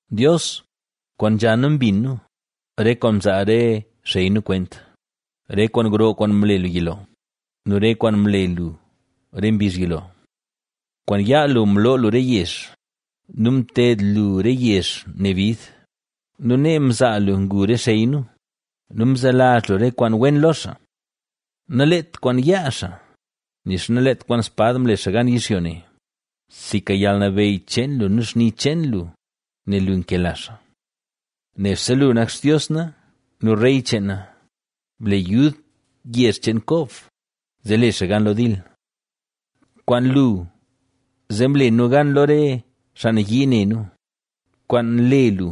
Dios, kwaan nzha nu mbin nu, re kwaan mzaa re xey nu kwent, re kwaan gro kwaan mle lu yilo nu re kwaan mle lu re mbizh yilo. Kwaan yaa lu mloo lu re yezh nu mted lu re yezh ne bid nu nee mzaa lu ngu re xey nu nu mzelazh lu re kwaan wen lo xaa. Naleet kwaan yaa xaa, nixa naleet kwaan spad mle xaa gan yizhyo ne; sinka yalnabeyy cheen lu nu xni cheen lu, nel lu nkela xaa. Nebse lu nak Xtios na nu rey cheen na, ble yud yezh cheen Kob, zee le xaa gan lo dil. Kwaan lu zee mle nu gan lo re xaa nayii ne nu; kwaan le lu,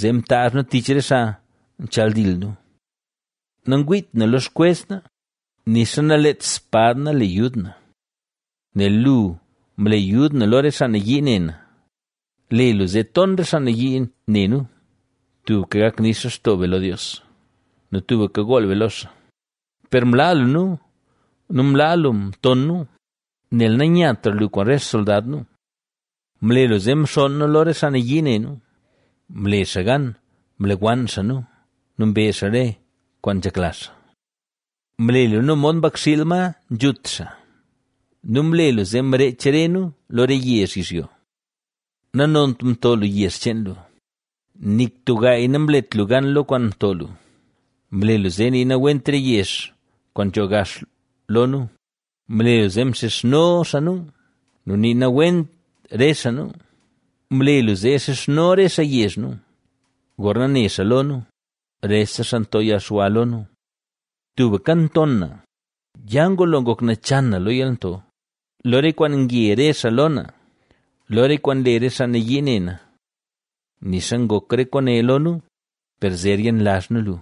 zee mtaazh nu tich re xaa nchaldil nu. Nangwiit na lo xkwez na, nixa naleet spad na le yud na, nel lu mle yud nu lo re xaa nayii ne nu, le lu zee ton re xaa nayii ne nu. Tubka gak nix lextoo be lo Dios nu tubka gool be lo xaa. Per mlaa lu nu, nu mlaa lu mton nu, nel nanyatra lu kwaan re xsoldad nu. Mle lu zee mxonn nu lo xaa nayii ne nu, mle xaa gan mlewann xaa nu, nu mbe xaa re kwaan nzhekla xaa. Mle lu nu mod mbakxiil, ma nzhut xaa nu mle lu zee mreech re nu lo re yezh yizhyo. Nanont mto lu yezh cheen lu, ¡nik tub gaay namlet lu gan lo kwaan mto lu! Mle lu zee nii nawent re yezh kwaan nzho gax lo nu; mle lu zee nxizhno xaa nu, nu nii nawent re xaa nu. Mle lu zee nxizhno re xaa yezh nu gorna ne xaa lo nu, rese xaa nto yalxwa lo nu. Tubka nton na, ya ngulo ngok nachan na lo yalnto, lo re kwaan nge re xaa lo na, lo re kwaan nle re xaa nayii ne na. Nixa ngok re kwaane lo nu, per zer yenlazh nu lu,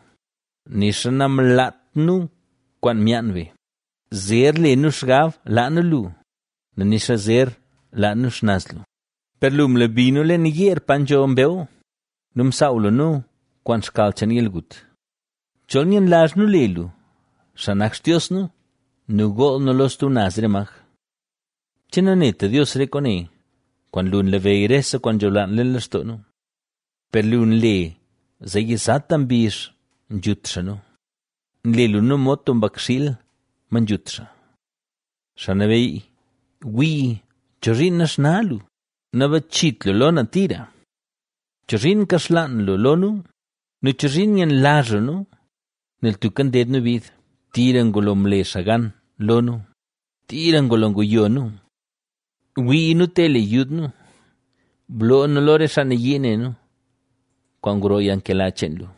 nixa namlaat nu kwaan myaan be; zer le nu xgab laa nu lu, nixa zer laa nu xnaz lu; per lu, mlebi nu leen yeer pa nzho mbew nu msaaw lu nu kwaan xkal cheen yalgut. Chol yenlazh nu le lu, xaa nak Xtios nu, nu gool nu lo stub naz re maj, ¿Che nanet Dios re kwaane? Kwaan lu nlabeyy rese kwaan nzholaan leen lextoo nu. Per lu nle zee yizata mbizh nzhut xaa nu; nle lu nu mod tub mbakxiil, ma nzhut xaa. Xaa Nabeyy, wii, ¿chozhiin naxna lu? Nabachit lu lo na tira. ¿Chozhiin nkaxlaan lu lo nu? Nu ¿chozhiin nyenlazh lu nu, nel tubka nded nu bid? Tira ngulo mle xaa gan lo nu, tira ngulo nguyo nu. Wii nu te le yud nu, bloo nu lo re xaa nayii ne nu, kwaan gro yalnkela cheen lu.